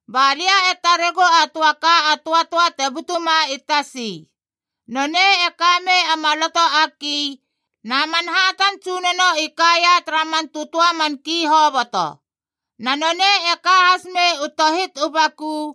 Ba lia e taregu a töa ka a töatöa te butuma i tasi. Nonei e ka mei a maloto a ki, na man hatan tsunono i kaia tara man tötöa man ki hoboto. Na nonei e ka has mei u tohit u baku,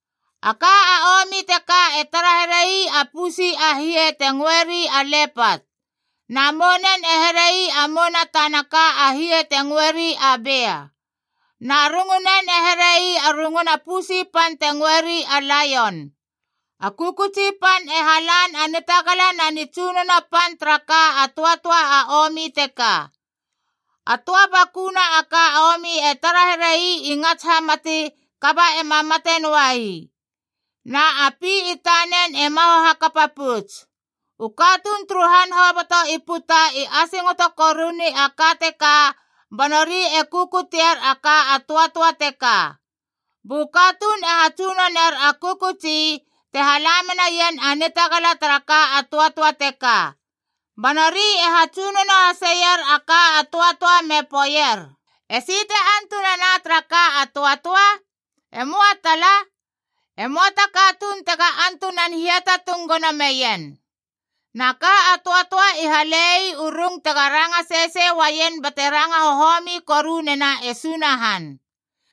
A ka a omi teka e tara here ii a pusi a hie te ngöeri a lepat.c Na mounen e here ii a mouna tana ka a hie te ngöeri a bea,d na rungnen e here ii a runguna pusi pan te ngöeri a laion. A kökötsi pan e halan a nitagala na nitsunono pan tara ka a töatöa a omi teka. A töa bakuna ka a omi e tara here ii i ngats hamati kaba ema mate nitöa ii. Na a pi i tanen e maho hakapa pouts. U katuun turu han hoboto i puta i asingoto koruni a ka teka ba nori e kukutier a ka a töatöa teka. Bu katuun e hatsunoner a kökötsi, te hala menaien a nitagala tara ka a töatöa teka. Ba nori e hatsunono haseier a ka a töatöa me poeier, “Esi te antunana tara ka a töatöa? E möa tala. E möa ta katuun tega antunan hiatatung gono meien!” Na ka a töatöa i hale ii u rung tega ranga sesei uaien bate ranga hohomi koru nena e Sunahan.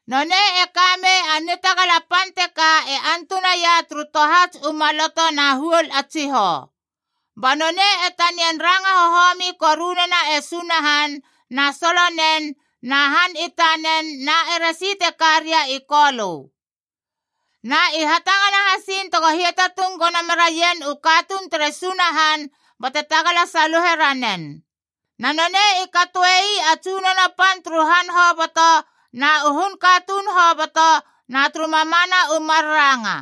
Nonei e ka mei a nitagala pan teka e antunaia turu tohats u maloto na huol a tsihou. Ba nonei e tanian ranga hohomi koru nena e Sunahan na solonen na han i tanen na eresi te ka ria i Kolö. Na i hatangana hasiin tego hiatatung gono meraien u katuun tere Sunahan bate tagala saluhe ranen. Na nonei i katoe ii a tsunono pan turu han hoboto na u hun katuun hoboto na turu mamana u mar ranga.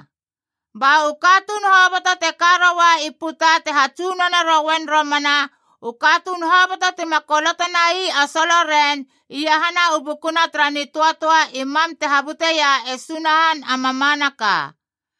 Ba u katuun hoboto te ka roua i puta te hatsunone rouen romana, u katuun hoboto tima koloto nai a soloren iahana u bukuna tara nitöatöa i mam te habuteia e Sunahan a mamanaka.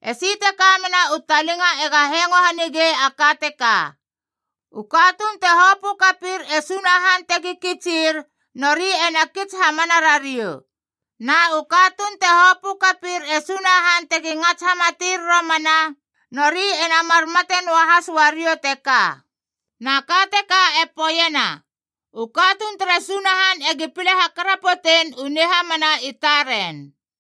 Esi te ka mena u talinga ega hengo hanige a ka teka: “U katuun te hopö kapir e Sunahan tegi kitsir, nori ena kits hamana rariou. Na u katuun te hopö kapir e Sunahan tegi ngats hamatir romana, nori ena mar mate noahas uariou teka.” Na ka teka e poeiena, u katuun tere Sunahan egi pile hakarapotein u nihamana i taren.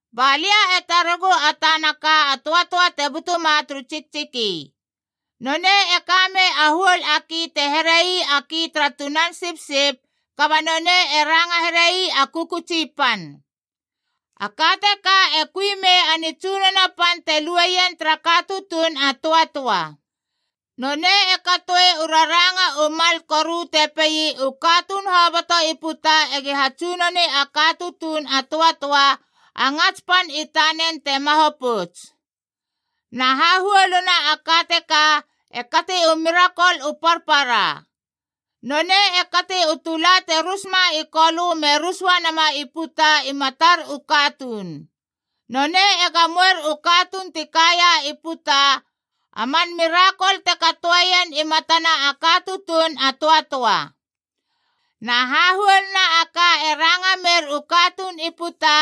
Ba lia e taregu a tana ka a töatöa te butuma turu tsiktsiki. Nonei e ka mei a huol a ki te here ii a ki tara tunan sipsip, kaba nonei e ranga here ii a kökötsi pan. A ka teka e kui mei a nitsunono pan te lue ien tara ka tutuun a töatöa. Nonei e katoe u raranga u mal koru te pei u katuun hoboto i puta egi hatsunoni a ka tutuun a töatöa, a ngats pan i tanen te maho pouts. Na hahuoluna a ka teka e kati u mirakol u parpara. Nonei e kati u tula te rusma i kolö me rus uanama i puta i matar u katuun. Nonei e gamoer u katuun ti kaia i puta a man mirakol te katoeien i matana a ka tutuun a töatöa. Na hahuoluna a ka e ranga mer u katuun i puta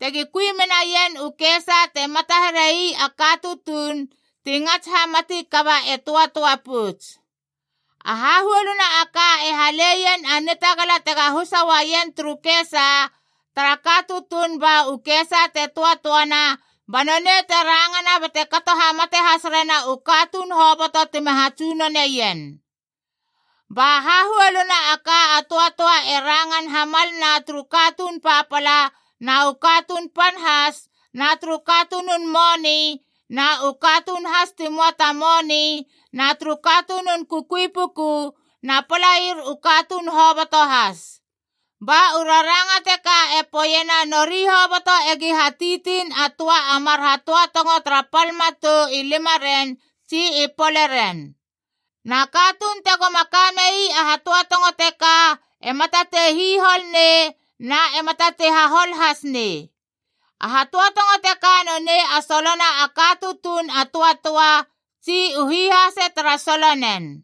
tegi kui menaien u kesa te mata here ii a ka tutuun ti ngats hamati kaba e töatöa pouts. A hahuoluna a ka e halein a nitagala tega husa uaien turu kesa tara ka tutuun ba u kesa te töatöana ba nonei te rangana bate kato hamate has rena u katuun hoboto tima hatsunoneien. Ba hahuoluna a ka a töatöa e rangan hamalna turu katuun papala na u katuun pan has, na turu katunun moni na u katuun has ti möa ta moni, na turu katunun kukui puku na palair u katuun hoboto has. Ba u raranga teka e poeiena nori hoboto egi hatitiin a töa a mar hatöatongo tara pal matou i limaren tsi i poleren. Na katuun tegoma ka mei a hatöatongo teka ema tatei hihol nei na ema tatei hahol has nei. A hatöatongo teka nonei a solona a ka tutuun a töatöa, tsi u hihase tara solonen.